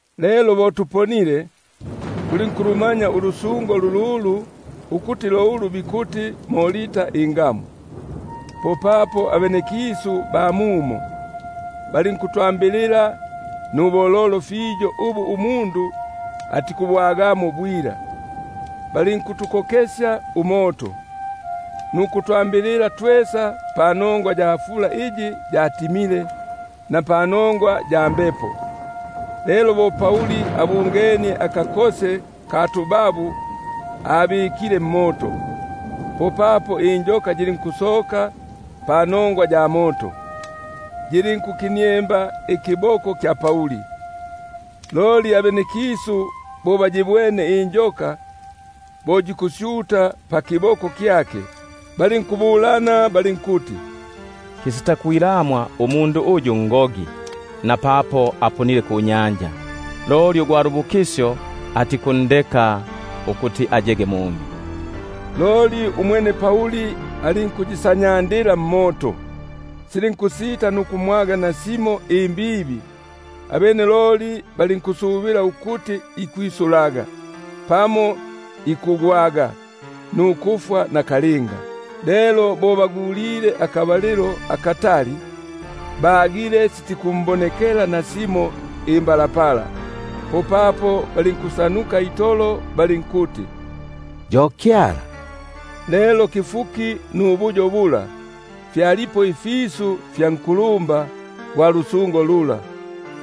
Lelo bo tuponile, tulinkulumanya ulusungo lululu, ukuti lo ulu bikuti Malta ingamu. Popapo abenekisu ba mumo, balinkutwambilila nubololo ubu umundu atikubwagamo bwila; balinkutukokesya umoto, nukulwambilila twesa panongwa ya fula iyi yatimile, na panongwa ya mbepo. Lelo bo Pauli abungenie akakose ka tubabu abikile mmoto, popapo injoka yilinkusoka panongwa ya moto, yilinkuniemba nkiboko kyake. Loli abenekisu bo bakabwene akandu aka ukusyuta pakiboko kyake, balinkubulana balinkuti: Kisita kwilamwa umundu uyu ngogi; napapo aponile kunyanja, loli ugwa lubukisyo atikundeka ukuti ayege mumi. Loli umwene alinkukasanyandila akandu kala mmoto, silinkusita nukumwaga nasimo imbibi. Abene loli balinkusubila ukuti ikwisulaga, pamo ikugwaga nukufwa nakalinga. Lelo bo bagulile akabalilo akatali, bagile sitikumbonekela nasimo imbalapala, popapo balinkugalabuka itolo, balinkuti yo kyala. Lelo pabupipi nubuyo bula, fyalipo ifisu fya nkulumba gwa lusungo lula,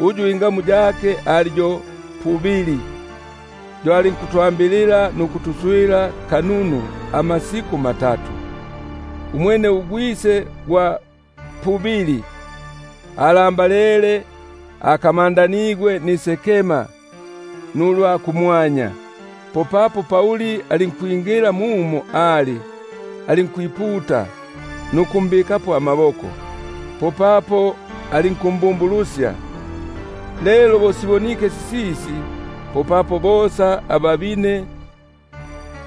uyu ingamu yake ali yo Publio; yo alinkutwa- mbilila nukutuswila bununu amasiku matatu. Umwene ugwise gwa Publio alambalele, akamandanigwe nisekema nulwa kumwanya.#ulwa kumwanya: bamo bikuti ulwa mukati. Popapo Pauli alinkwingila muno ali, alinkwiputa nukumbikapo amaboko; popapo alinkumbumbu- lusya. Lelo bo sibonike sisisi, popapo bosa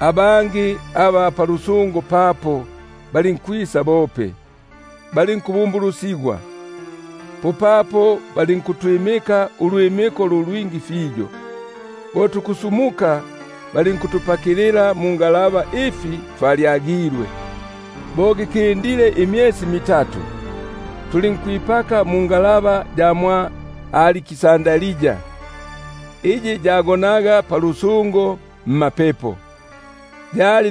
abangi aba palusungo papo balinkwisa bope, balinkubumbulusigwa. Popapo balinkutwimika ulwimiko lu lwingi fiyo; bo tukusumuka, po balinkutupakilila ifi twalyagilwe. Bo gikindile imyesi mitatu, tulinkwipaka mungalaba ya mwʼAliksandria, iyi yagonaga palusungo mmapepo; yali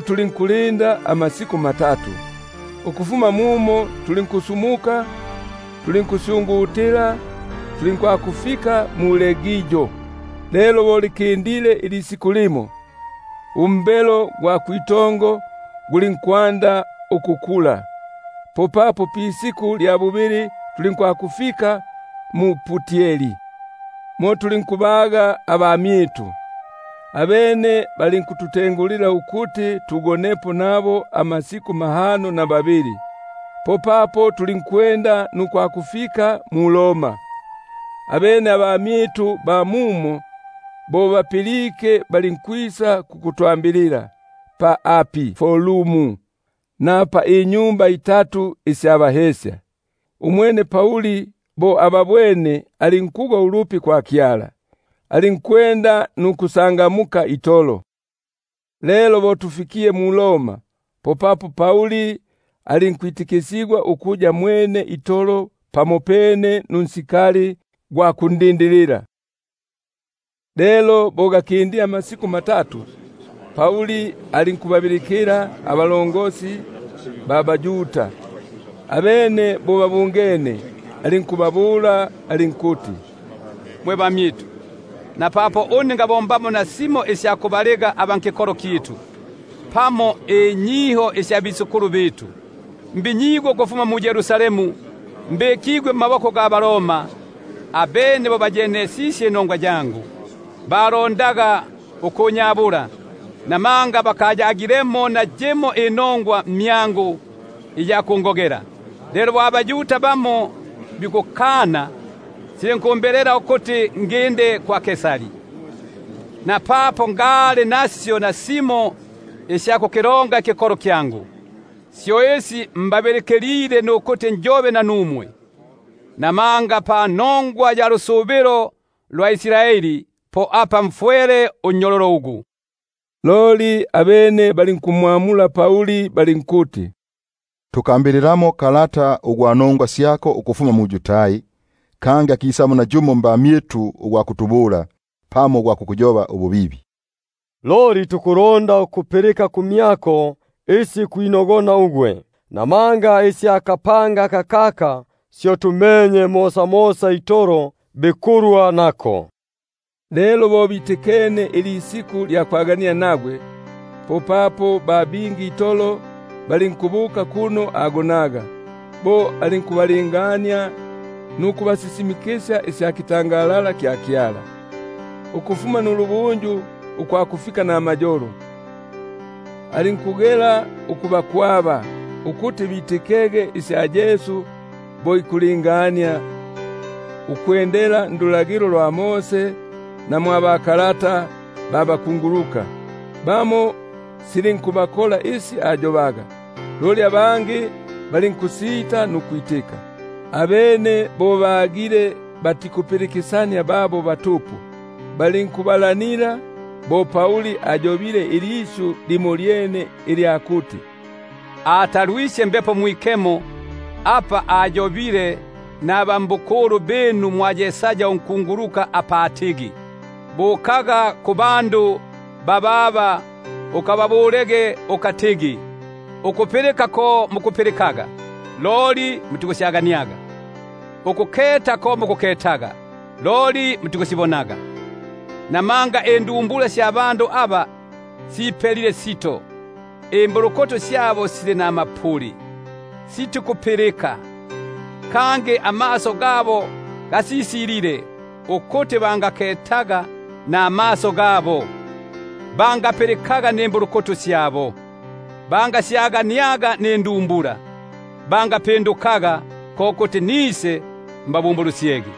tulinkulinda amasiku matatu. Ukufuma mumo tulinkusyungutila tulinkwakufika mu-Regio; lelo bo fikindile ilisiku limo, umbelo gwa kwitongo gulinkwanda ukukula. Popapo pisiku lya bubili tulinkwakufika mu-Putioli. Mo lulinkubaga abamyitu, abene balinkututengulila ukuti tugonepo nabo amasiku mahano na mabili; popapo tulinkwakufika mu-Roma. Abene abamyitu aba mumo bo bapilike, balinkwisa kukutwambilila pa Apiforo na pa Triotaberini. Umwene Pauli bo ababwene, alinkugwa ulupi kwa Kyala, alinkwenda nukwikasya itolo. Lelo bo mfikile mu-Roma, popapo Pauli alinkwitikisigwa ukuya mwene itolo pamopene nunsikali gwa kundindilila. Lelo bo gakindile amasiku matatu, alinkubabilikila abakulumba mbaYuda; abene bo babungene, alinkubabula alinkuti: Mwe bamyitu, napapo une ngabombamo nasimo isya kubaliga aba kikolo kyitu, pamo inyiho sya batata, mbinyigwe ukufuma mu-Yerusalemu, mbikigwe mmaboko ga baRoma. Abene bo bayenesisye inongwa yangu, balondaga ukunyabula, namanga bakayagilemo nayimo inongwa mmyangu iya kungogela. Lelo bo abaYuda bikukana, silinkumbelela ukuti nginde kwa Kaisari; napapo ngaya nasyo nasimo isya kukilonga ikikolo kyangu. Syo isi mbabilikilile nukuti njobe nanumwe; namanga panongwa ya lusubilo lwa Israeli, po apa mfwele minyololo ugu. Loli abene balinkumbula balinkuti: Tukambililamo kalata ugwa nongwa syako ukufuma mu-Yudai; kangi akisamo nayumo mbamyitu ugwa kutubula, pamo ugwa kukuyoba ububibi. Loli tukulonda ukupilika kumyako isi kwinogona ugwe; namanga isya kapanga kakaka syo tumenye ukuti mosamosa itolo bikulwa nako. Lelo bo bitikene ilisiku lya kwaganila nagwe, popapo ba bingi itolo balinkubuka kuno agonaga; bo alinkubalingania nukubasisimikisya isya butwa bwa Kyala, ukufuma nulubunju ukwakufika namayolo, alinkubatobesya isya Yesu, ukufuma ndulagilo lwa Mose na mbakunguluka. Bamo silinkubakola isi ayobaga, loli abangi balinkusita nukwitika. Abene bo bagile batikupilikisania babo batupu, balinkubalanila bo Pauli ayobile ilisyu limolyene ilya kuti: Atalwisye Mbepo Mwikemo, apa ayobile nabisemwe mwa Yesaya unkunguluka apa atigi: Bukaga kubandu bababa ukababulege ukatigi: Ukupilika ko mukupilikaga, loli mutikusyaganiaga; Ukuketa ko mukuketaga, loli mutikusibonaga; Buno indumbula sya bandu aba sipelile sito, Imbulukutu syabo sili namapuli ukupilika, Kangi amaso gabo gasisilile; Ukuti bangaketaga namaso, Bangapilikaga nimbulukutu, Bangasyaganiaga nindumbula, bangapindukaga, Ko kuti nisembabumbulusye.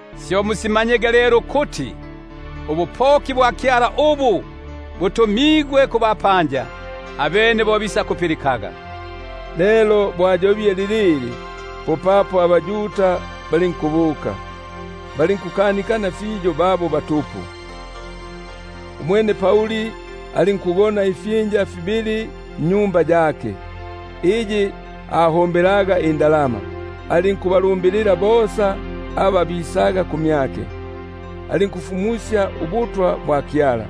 Syo musimanyege lelo ukuti, ubupoki bwa Kyala ubu, butumigwe kubapanja, abene bo bisakupilikaga. [Lelo bo ayobile lilili, popapo abaYuda balinkubuka, balinkukanikana fiyo babo batupu.] Umwene alinkugona ifyinja fibili nnyumba yake, iyi abombelaga indalama, alinkubalumbilila bosa aba bisaga kumyake. Alinkufumusya ubutwa bwa Kyala,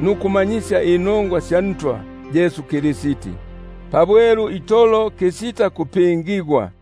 nukumanyisya inongwa sya Ntwa Yesu Kristi pabwelu itolo kisita kupingigwa.